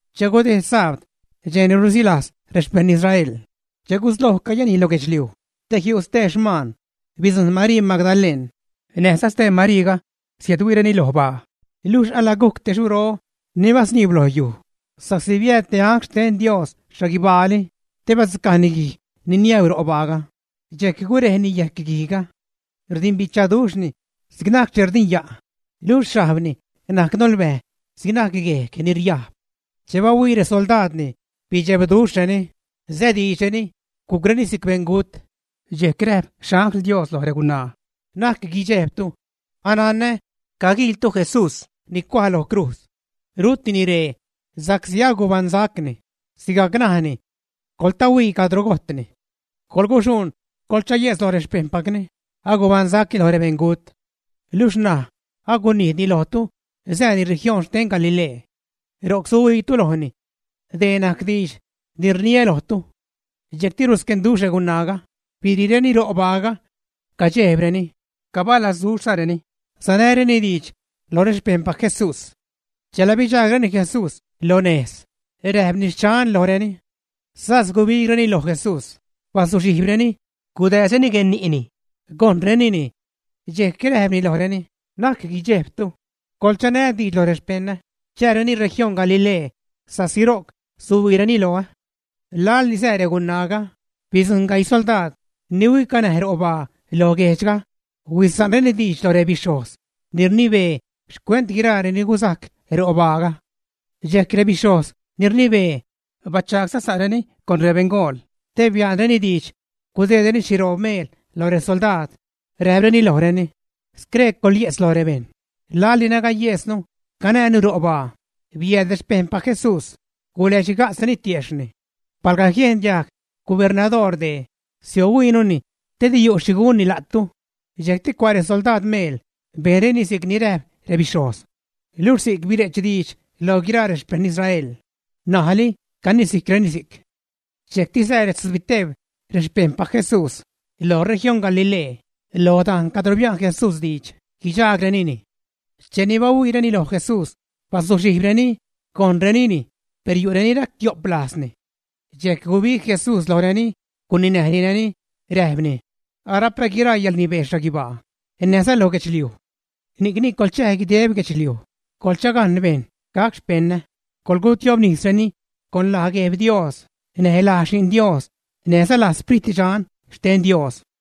Che gudejd sabd, dxej ni ruzilajz rexpejṉ Israel, che gusloj cayänij lo guedxliuj te jiu' stee xmaan, bidzujṉ Marii Magdaleṉ näjza stee Mariiga, siädhuiireni lo baa. Luxh alagujc te xuro ni basniib lo yuj, sa'csi biääd te angl xten Dios xhaguibaali te badzucajni guij ni niäuu ro' baaga, dxejc gurejni yejc guijga. Rdimbichaduxhni si'c najc che rdinya', luxh xhajbni najc nolbäj si'c najc yejg ni riajb. Che bahuii resoldaadni, bichebduxhreni, sädiidxreni, gujcreni si'c beṉgut. Dxejc räjp guixhajg xte Diosga loj regunaa: ―Na'c guidxejbtu. Ananä caguiiltu Jesús ni cuaj lo crujz. Rutini ree sa'csi agubaṉsacni sigajc ni najni. Coḻtahuii cadro gojtni. Coḻguxuṉ, coḻchaye'tz loj rexpejṉpacni agubaṉsacni loj rebeṉgut. Luxh ṉaj agunijdni lojtu sääni región xten Galilee. Ro'c suhuiitu lojni. Dee najc diidx ni rniä lojtu. Dxejcti rusquenduxh regunaaga, biriireni ro' baaga. Cadxejbreni, cabalazduxhzareni sanäreni diidx loj rexpejṉpac Jesús. Chela bidxaagreni Jesús lo nejz, räjpni: “Xchan”, lojreni. Sas gubigreni loj Jesús, bazuxhijbreni, gudääzreni guenni'ni, gojṉrenini. Dxejc räjpni lojreni: ―Na'c guidxejbtu. Coḻchanä diidx loj rexpeṉä, chääreni región Galilee, sa'csi ro'c suhuiireni loä. Laḻni sää regunaaga, bidzujṉ gaii soldaad ni huicanäj ro' baa lo guejdxga, huisa'nreni diidx lo rebixhojz ni rnibee xcuent guiraa ni guzajc ro' baaga. Dxejc rebixhojz ni rnibee bachagsa'zareni con rebeṉgool te bia'nreni diidx gudeedreni xhiroob meel lo resoldaad, räjpreni lojreni: ―Scree coḻye'tz lo rebejṉ: “Laḻ ni nagayesnu, canäjnu ro' baa, biääd rexpejṉpac Jesús guläxhiga'tzreni tiejxhni.” Palga jiendiajg gubernadoor dee, siohuiinuni te di yu' xhi gunni la'tu. Dxejcti cua' resoldaad meel, bejnreni si'cni räjp rebixhojz. Luxh si'c bire'ch diidx loj guiraa rexpeṉ Israel. N̲ajli canisijcreni si'c. Dxejcti sää retzubiteeb xpejṉpac Jesús lo región Galilee, lo dajn cadro bia'n Jesús diidx guidxaagnireni. Cheni bahuiireni loj Jesús, bazuxhijbreni, gojṉrenini, per yu' reni ractio'p lajzreni. Dxejc gubig Jesús lojreni, guninäjnireni, räjpni: ―Arapä guiraa yäḻrnibee xhaguibaa näjza lo guedxliuj. Ni'cni, coḻchäj, guideb guedxliuj coḻchagajn bejṉ gac xpeṉä, coḻgutiobnisreni, con laj Gueb Dios, näj laj Xi'n Dios näjza laj Sprit Dxan xten Dios.